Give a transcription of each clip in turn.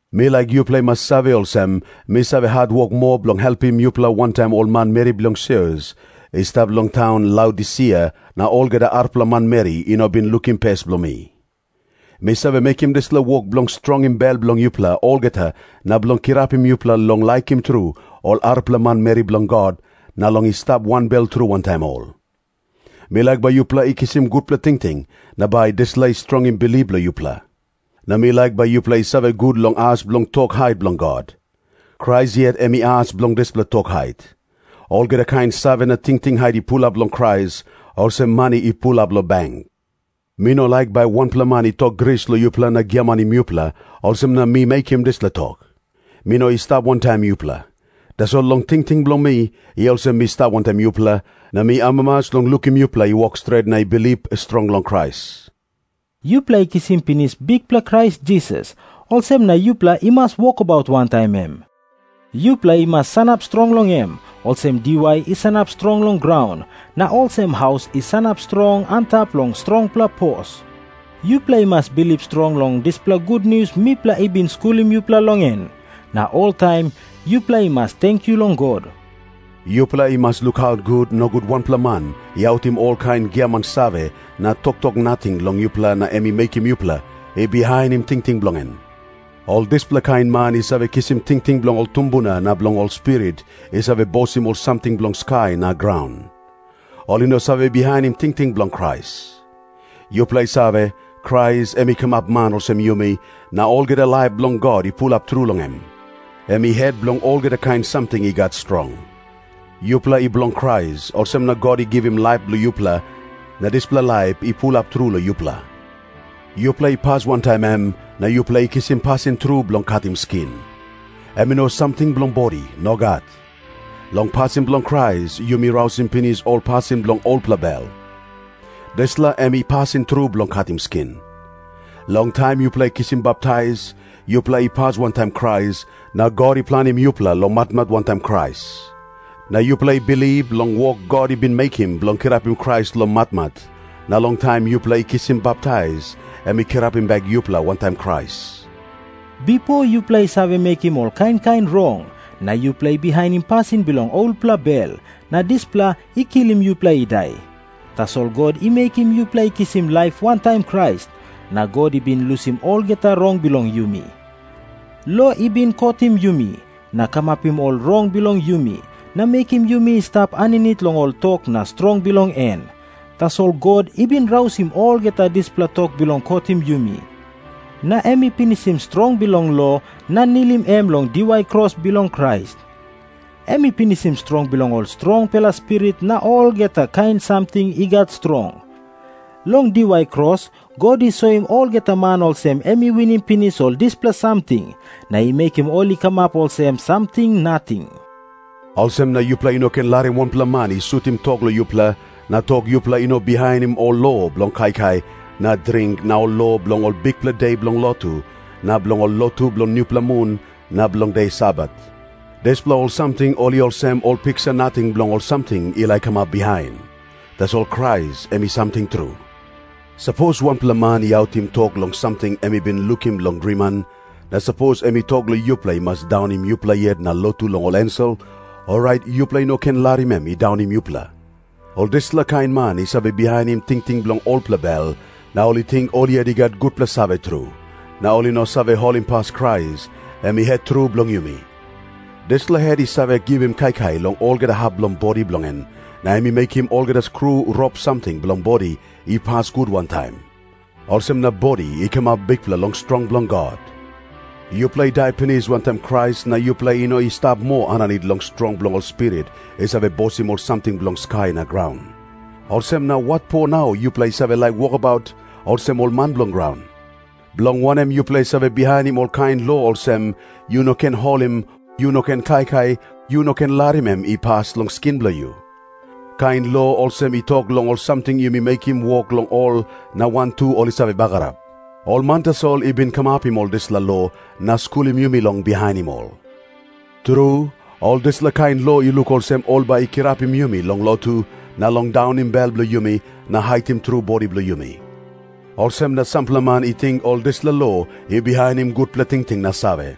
Mi laik yupela i mas save olsem, mi save hatwok moa bilong helpim yupela wantaim ol manmeri bilong sios i stap long taun Laodisia, na olgeta arapela manmeri i no bin lukim pes bilong mi. Mi save mekim dispela wok bilong strongim bel bilong yupela olgeta na bilong kirapim yupela long laikim tru ol arapela manmeri bilong God na long i stap wanbel tru wantaim ol. Mi laik bai yupela i kisim gutpela tingting, na bai dispela i strongim bilip bilong yupela. Na mi laik bai yupela i save gut long as bilong tok hait bilong God. Krais yet em i as bilong dispela tok hait. Olgeta kain save na tingting hait i pulap long Krais, olsem mani i pulap long beng. Mi no laik bai wanpela man i tok gris long yupela na giamanim yupela, olsem na mi mekim dispela tok. Mi no i stap wantaim yupela. Tasol long tingting bilong mi, i olsem mi stap wantaim yupela, na mi amamas long lukim yupela i wok stret na i bilip strong long Krais. Yupela i kisim pinis Bikpela Krais Jisas, olsem na yupela i mas wokabaut wantaim em. Yupela i mas sanap strong long em, olsem diwai i sanap strong long graun, na olsem haus i sanap strong antap long strongpela pos. Yupela i mas bilip strong long dispela gutnius mipela i bin skulim yupela long en, na oltaim yupela i mas tenkyu long God. Yupela i mas lukaut gut, nogut wanpela man i autim olkain giaman save na toktok nating long yupela na em i mekim yupela i bihainim tingting bilong en. Ol dispela kain man i save kisim tingting bilong ol tumbuna na bilong ol spirit i save bosim ol samting bilong skai na graun. Ol i no save bihainim tingting bilong Krais. Yupela i save, Krais em i kamap man olsem yumi, na olgeta laip bilong God i pulap tru long em. Em i het bilong olgeta kain samting i gat strong. Yupela i bilong Krais, olsem na God i givim laip long yupela, na dispela laip i pulap tru long yupela. Yupela i pas wantaim em, na yupela i kisim pasin tru bilong katim skin. Em i no samting bilong bodi. Nogat. Long pasin bilong Krais yumi rausim pinis ol pasin bilong olpela bel. Dispela em i pasin tru bilong katim skin. Long taim yupela i kisim baptais, yupela i pas wantaim Krais, na God i planim yupela long matmat wantaim Krais. Na yupela i bilip long wok God i bin mekim bilong kirapim Krais long matmat, na long taim yupela i kisim baptais em i kirapim bek yupela wantaim Krais. Bipo yupela i save mekim ol kain kain rong, na yupela i bihainim pasin bilong olpela bel, na dispela i kilim yupela i dai. Tasol God i mekim yupela i kisim laip wantaim Krais, na God i bin lusim olgeta rong bilong yumi. Lo i bin kotim yumi na kamapim ol rong bilong yumi, na mekim yumi i stap aninit long ol tok na strong bilong en. Tasol God i bin rausim olgeta dispela tok bilong kotim yumi, na em i pinisim strong bilong lo na nilim em long diwai kros bilong Krais. Em i pinisim strong bilong ol strongpela spirit na olgeta kain samting i gat strong. Long diwai kros God i soim olgeta man olsem em i winim pinis ol dispela samting na i mekim ol i kamap olsem samting nating. Olsem na yupela i no ken larim wanpela man i sutim tok long yupela, na tok yupela i no bihainim ol lo bilong kaikai na dring na ol lo bilong ol bikpela de bilong lotu na bilong ol lotu bilong nupela mun na bilong de Sabat. Dispela ol samting ol i olsem ol piksa nating bilong ol samting i laik kamap bihain. Tasol Krais em i samting tru. Sapos wanpela man i autim tok long samting em i bin lukim long driman, na sapos em i tok long yupela i mas daunim yupela yet na lotu long ol ensel, orait yupela i no ken larim em i daunim yupela. Ol dispela kain man i save bihainim tingting bilong olpela bel na ol i ting ol yet i gat gutpela save tru, na ol i no save holimpas Krais, em i het tru bilong yumi. Dispela het i save givim kaikai long olgeta hap bilong bodi bilong en, na em i mekim olgeta skru rop samting bilong bodi i pas gut wantaim. Olsem na bodi i kamap bikpela long strong bilong God. Yupela i dai pinis wantaim Krais na yupela i no i stap moa aninit long strong bilong ol spirit i save bosim ol samting bilong skai na graun. Olsem na watpo nau yupela i save wokabaut olsem ol man bilong graun? Bilong wanem yupela i save bihainim ol kain lo olsem, “Yu no ken holim, yu no ken kaikai, yu no ken larim em i pas long skin bilong yu”? Kain lo olsem i tok long ol samting yumi mekim wok long ol na wantu ol i save bagarap. Ol man tasol i bin kamapim ol dispela lo na skulim yumi long bihainim ol. Tru, ol dispela kain lo i luk olsem ol bai i kirapim yumi long lotu, na long daunim bel bilong yumi na hatim tru bodi bilong yumi. Olsem na sampela man i ting ol dispela lo i bihainim gutpela tingting na save.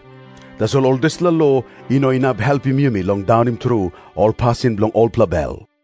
Tasol ol dispela lo i no inap helpim yumi long daunim tru ol pasin bilong olpela bel.